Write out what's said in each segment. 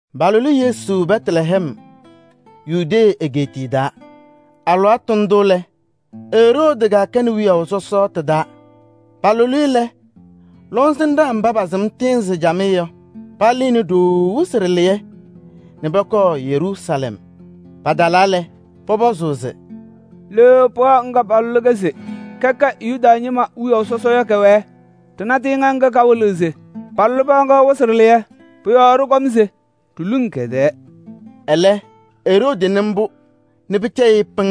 Palʋlɩ Yesu Bɛtlɛhɛm Yudee egeetiye taa. Alɩwaatʋ ndʋ lɛ, Eroodi kɛkɛnɩ wiyaʋ sɔsɔ ɖɩ-taa. Palʋlɩ-ɩ lɛ, lɔŋsɩnɖaa mba pasɩm tɩɩnzɩ camɩyɛ yɔ, palɩnɩ ɖooo wɩsɩ ɖɩlɩyɛ nɛ pɔkɔɔ Yeruusalɛm. Patalaa lɛ, pɔpɔzʋʋ se: “Le pɩɣa ŋga palʋlɩ-kɛ se kɔkɔŋ kɛʋ Yuda ñɩma wiyaʋ sɔsɔ yɔ kɛwɛɛ? Ɖɩna tɩɩŋa ŋga kawɩlɩɣ se palʋlɩ pɩɣa ŋga yɔ wɩsɩ ɖɩlɩyɛ. Pʋ-yɔɔ ɖɩkɔm se ɖiluŋ kɛ-tɛɛ.” Ɛlɛ, Eroodi nɩɩ mbʋ nɛ pɩcɛyɩ-ɩ pɩŋŋ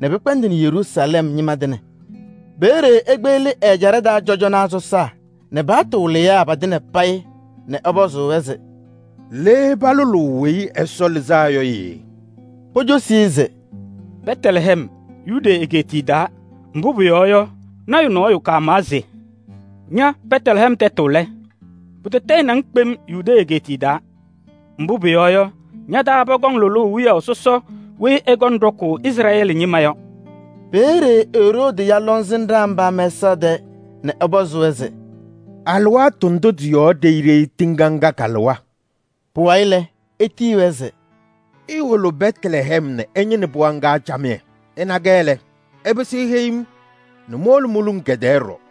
nɛ pɩkpɛndɩnɩ Yeruusalɛm ñɩma tɩŋa. Peeye ekpeɣli ɛ-ɛjaɖɛ taa cɔjɔnaa sɔsaa nɛ paɣtʋ wɩlɩyaa patɩŋa payɩ nɛ ɛpɔzʋʋ-wɛ se: “Le palʋlʋʋ Weyi Ɛsɔ Lɩzaa Yɔ yee?” Pocosi-i se: “Bɛtlɛhɛm, Yudee egeetiye taa. Mbʋ pʋyɔɔ yɔ, lɔɔyaɣ tʋ nɔɔyʋ kamawa se: ‘Ña Bɛtlɛhɛm tɛtʋ lɛ! Pʋtɔtɔyɩnɩ-ŋ kpem Yudee egeetiye taa. Mbʋ pʋyɔɔ yɔ, ña-taa pɔkɔŋ lʋlʋʋ wiyaʋ sɔsɔ weyi ɛkɔŋ ɖɔkʋʋ Izrɛɛlɩ ñɩma yɔ.’” Peeye Eroodi ya lɔŋsɩnɖaa mba mɛsaɣ tɛɛ nɛ ɛpɔzɩ-wɛ se: “Alɩwaatʋ ndʋ tɩ-yɔɔ ɖeyi ɖeyi tɩɩŋa ŋga kalɩwa?” Pʋwayɩ lɛ, etiyi-wɛ se: “Iwolo Bɛtlɛhɛm nɛ ɩñɩnɩ pɩɣa ŋga camɩyɛ. Ɩna-kɛ lɛ, ɩpɩsɩ iheyi-m nɛ mowolo moluŋ kɛ-tɛɛ ɖɔɖɔ.”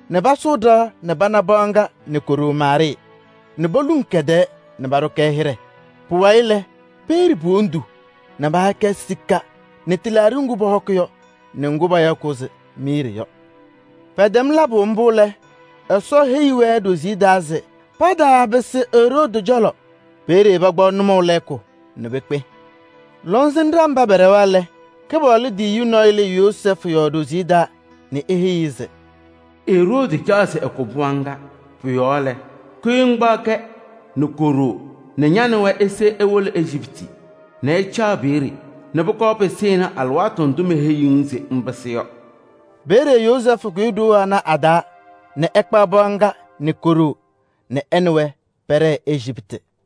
nɛ pasʋʋ ɖɩɣa nɛ pana pɩɣa ŋga nɛ ko-ɖoo Maarɩɩ nɛ poluŋ kɛ-tɛɛ paɖʋ-kɛ hɩɖɛ. Pʋwayɩ lɛ, pɛyɛɖɩ po-wondu nɛ paha-kɛ sika nɛ tɩlaaɖɩ ŋgʋ pɔhɔkɩ yɔ nɛ num mbʋ payaɣ se miiri yɔ. Pɛtɛm labʋ mbʋ lɛ, Ɛsɔ heyi-wɛ nɛ ɖoziye taa se pataapɩsɩ Eroodi cɔlɔ. Peeye pakpaɣ nʋmɔʋ lɛɛkʋ nɛ pekpe. Lɔŋsɩnɖaa mba pɛɖɛwa lɛ, Kɩpaɣlʋ tiyiyu nɔɔyʋ lɩɩ Yozɛɛfʋ yɔɔ ɖoziye taa nɛ eheyi-i se: “Eroodi caɣ se ɛkʋ pɩɣa ŋga. Pʋ-yɔɔ lɛ, kʋyɩ ŋkpaɣ ka nɛ ko-ɖoo nɛ ña nɛ wɛ ise iwolo Ejiptɩ nɛ ɩcaɣ peeye nɛ pʋkɔɔ pɩsɩnɩ alɩwaatʋ ndʋ meheyiɣ-ŋ se ɩpɩsɩ yɔ.” Peeye Yozɛɛfʋ kʋyɩ ɖoo ana a-taa nɛ ɛkpaɣ pɩɣa ŋga nɛ ko-ɖoo nɛ ɛ nɛ wɛ pɛɖɛɛ Ejiptɩ.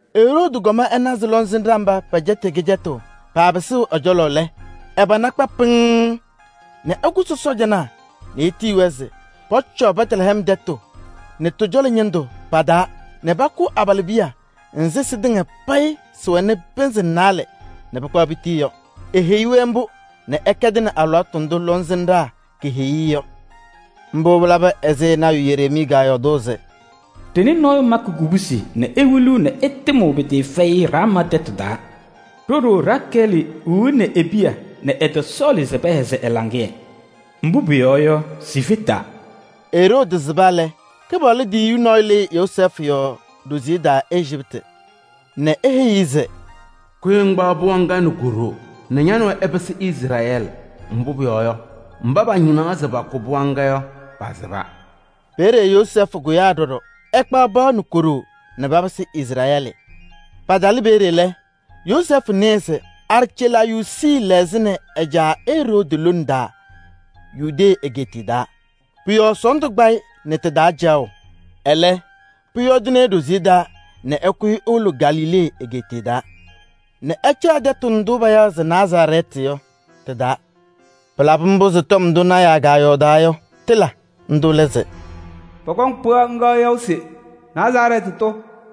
Eroodi kɔm ɛna se lɔŋsɩnɖaa mba pɛcɛtɩ-ɩ kɩcɛtʋ, paapɩsɩɣ ɛ-cɔlɔ lɛ, ɛ-pana kpa pɩŋŋ nɛ ɛkʋsɩ sɔɔjanaa nɛ etiyi-wɛ se pɔcɔɔ Bɛtlɛhɛm tɛtʋ nɛ tɩ-cɔlɔ ñɩndʋ pa-taa nɛ pakʋ abalɩbiya nzɩ sɩtɩŋa payɩ sɩwɛnɩ pɩnzɩ naalɛ nɛ pɩkpaɣ pitii yɔ. Eheyi-wɛ mbʋ nɛ ɛkɛdɩnɩ alɩwaatʋ ndʋ lɔŋsɩnɖaa keheyi-i yɔ. Mbʋ pɩlaba ɛzɩ lɔɔyaɣ tʋ Yereemii kɔyɔɔdʋʋ se: “Ɖɩnɩ nɔɔyʋ makɩ kubusi nɛ ewiliɣ nɛ ɛtɩmɩɣ pɩtɩɩfɛyɩ Raamaa tɛtʋ taa. Ɖo-ɖoo Rakɛɛlɩ wiɣni e-piya nɛ ɛtɔsɔɔlɩ se pɛhɛzɩ ɛ-laŋɩyɛ. Mbʋ pʋyɔɔ yɔ, sifetaa.” Eroodi sɩba lɛ, Kɩpaɣlʋ tiyiyu nɔɔyʋ lɩɩ Yozɛɛfʋ yɔɔ ɖoziye taa Ejiptɩ nɛ eheyi-i se: “Kʋyɩ ŋkpaɣ pɩɣa nɛ ko-ɖoo nɛ ña nɛ wɛ ɩpɩsɩ Izrɛɛlɩ. Mbʋ pʋyɔɔ yɔ, mba pañɩnaɣ se pakʋ pɩɣa ŋga yɔ, pasɩba.” Peeye Yozɛɛfʋ kʋyaa ɖɔɖɔ ɛkpaɣ pɩɣa nɛ ko-ɖoo nɛ papɩsɩ Izrɛɛlɩ. Patalɩ peeye lɛ, Yozɛɛfʋ nɩɩ se Arcɛlaayuusi lɛɣzɩnɩ ɛ-caa Eroodi lone taa Yudee egeetiye taa. Pʋ-yɔɔ sɔɔndʋ kpa-ɩ nɛ ɖɩ-taa caɣʋ. Ɛlɛ, pʋyɔɔdɩnɩ-ɩ ɖoziye taa nɛ ɛkʋyɩ ewolo Galilee egeetiye taa nɛ ɛcaɣ tɛtʋ ndʋ payaɣ se Nazarɛɛtɩ yɔ tɩ-taa. Pɩlabɩ mbʋ se tɔm ndʋ lɔɔyɩsɩ tɩnaa kɔyɔɔdaa yɔ, tɩla. Ndʋ lɛ se: “Pɔkɔŋ pɩɣa ŋga yaʋ se Nazarɛɛtɩ tʋ.”